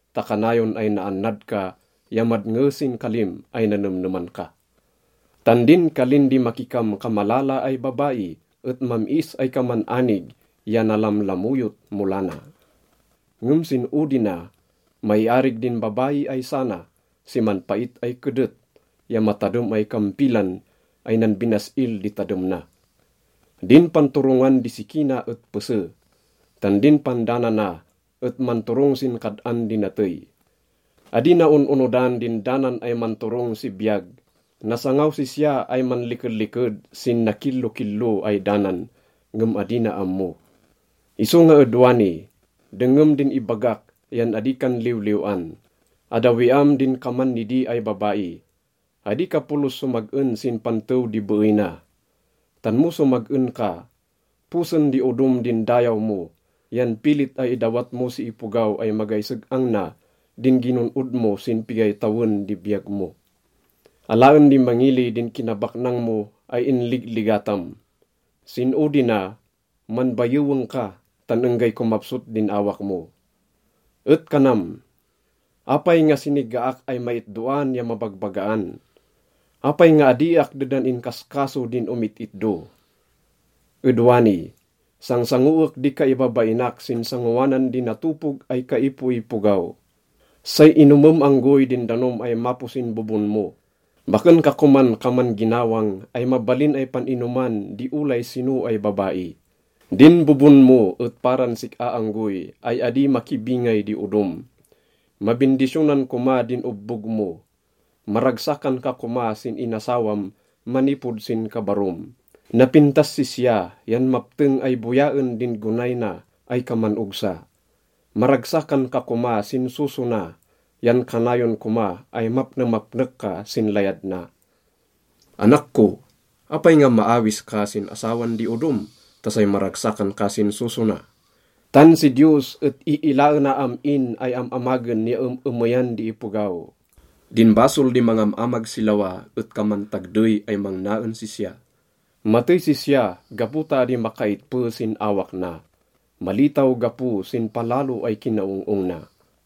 ta kanayon ay naannad ka ya madnge sin kalim ay nanemneman ka. Tan din kalin di makikamkamalala ay babai et mam-is ay kaman anig ya nalamlamoyot mo lana, ngem sin odi na, maiarig din babai ay sana si manpait ay kedet ya matadem ay kampilan ay nanbinas-il di tadem na. Din panturongan di siki na et pese, tan din pandanana et manturong sin kad-an di natey. Adi na on-onodan din danan ay manturong si biyag. Nasangaw sisya ay manlikeliked sin nakillokillo ay danan, ngem adi na ammo. Isonga ed wani, dengngem din ibagak yan adi kan liwliw-an. Addawiam din kaman nidi ay babai. Adi ka polos somag-en sin pantew di beey na. Tan mo somag-en ka, posen di odom din dayaw mo yan pilit ay idawat mo si ipogaw ay magay seg-ang na din ginon-od mo sin pigay tawen di biyag mo. Alaen di mangili din kinabaknang mo ay inligligatam. Sin odi na, manbayeweng ka tan enggay komapsot din awak mo. Et kanam, “Apay nga sinigaak ay maitdoan ya mabagbagaan? Apay nga adiak dedan inkaskaso din omit-itdo? Ed wani, sangsangoek di kaibabainak sin sangoanan di natopog ay kaipoipogaw.” Say inomem anggoy din danom ay mapo sin bobon mo. Baken ka koman kaman ginawang ay mabalin ay pan-inoman di olay sino ay babai. Din bobon mo et paran sik-a anggoy ay adi makibingay di odom. Mabindisyonan koma din obbog mo. Maragsakan ka koma sin inasawam manipod sin kabarom. Napintas sisya yan mapteng ay boyaen din gonay na ay kaman ogsa. Maragsakan ka koma sin soso na yan kanayon koma ay mapnemapnek ka sin layad na. Anak ko, apay nga maawis ka sin asawan di odom ta say maragsakan ka sin soso na? Tan si Diyos et iilaena am-in ay am-amagen ya em-emeyan di ipogaw. Din basol di mangam-amag si lawa et kaman tagdey ay mangna en sisya. Matey sisya gapo ta adi makaitpe sin awak na, malitaw gapo sin palalo ay kinaong-ong na.